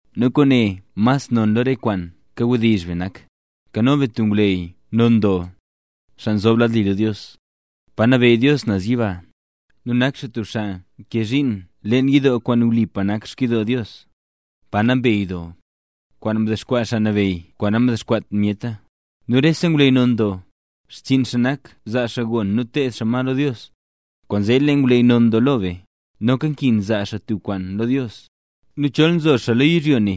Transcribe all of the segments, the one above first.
Nu kwaane mas non lo re kwaan kawdizh be nak: Nkano be tub ngwleyy non doo, xaa nzob lad li lo Dios, pa nabeyy Dios naz yiba. Nu nkee xaa zhiin leen yidoo kwaan wlipa nak xkyidoo Dios, Pa Nambey Doo, kwaan mdexkwaa Xaa Nabeyy kwaan namdexkwaat myeta. Nu rese ngwleyy non doo, xchiin xaa nak zaa xaa gon nu teed xaa ma lo Dios, kwaanzee lee ngwleyy non doo lo be, noka nkin zaa xaa tub kwaan lo Dios. Nu chol nzo xaa lo yizhyo ne,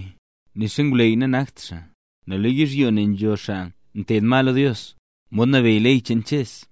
nixa ngwleyy nanakt xaa, nel lo yizhyo ne nzhola xaa nteed ma lo Dios, mod nabeyy ley cheen Ches,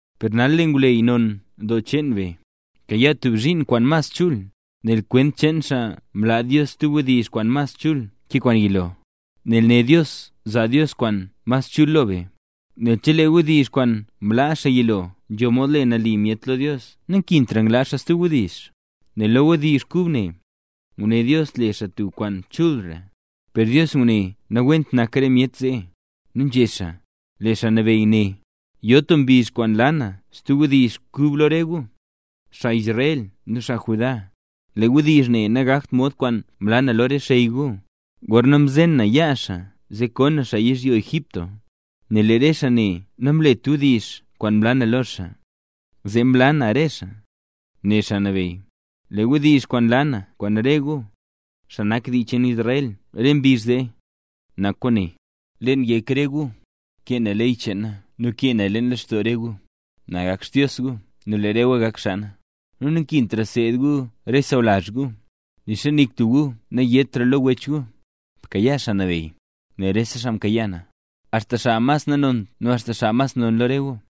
Per nal lee ngwleyy non doo cheen be, mkayaa tub zhiin kwaan mas chul, nel kwent cheen xaa mlaa Dios stub wdizh kwaan mas chul ke kwaan yilo, nel né Dios zaa Dios kwaan mas chul lo be. Nel chelee wdizh kwaan mlaa xaa yilo nzho mod le nali myet lo Dios nankintra nglaa xaa stub wdizh, nel lo wdizh kub ne, nguné Dios le xaa tub kwaan chulra. Per Dios ngune nawent nak re myet zee, nu nzhé xaa: Lee Xaa Nabeyy né: “Yo tub mbizh kwaan laa na stub wdizh kub lo re gu, xaa Israel nu xaa Judá. Lee wdizh ne nagakt mod kwaan mlaa na lo re xey gu, gorna mzen na yaa xaa zee ko na xaa yizhyo Egipto; nel lee re xaa ne namlet wdizh kwaan mlaa na lo xaa, zee mlaa na re xaa”, né Xaa Nabeyy. “Lee wdizh kwaan laa na kwaan re gu, xaa nak dii cheen Israel re mbizh zee, nak kwaane: Leen yek re gu, kee na ley cheen na nu kee naya leen lextoo re gu. Na gak Xdios gu nu lee re gu gak xaa na. Nu nankintra seed gu re sawlazh gu, nixa nik tub gu nayétra lo wech gu: ‘Bkayaa Xaa Nabeyy’, nel rese xaa mkayaa na, axta xaa mas nanont nu xaa mas non lo re gu.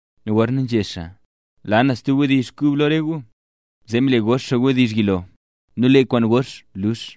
Nu gorna nzhé xaa: “Laa na stub wdizh kub lo re gu”, zee mle gox xaa wdizh yilo. Nu lee kwaan gox lux.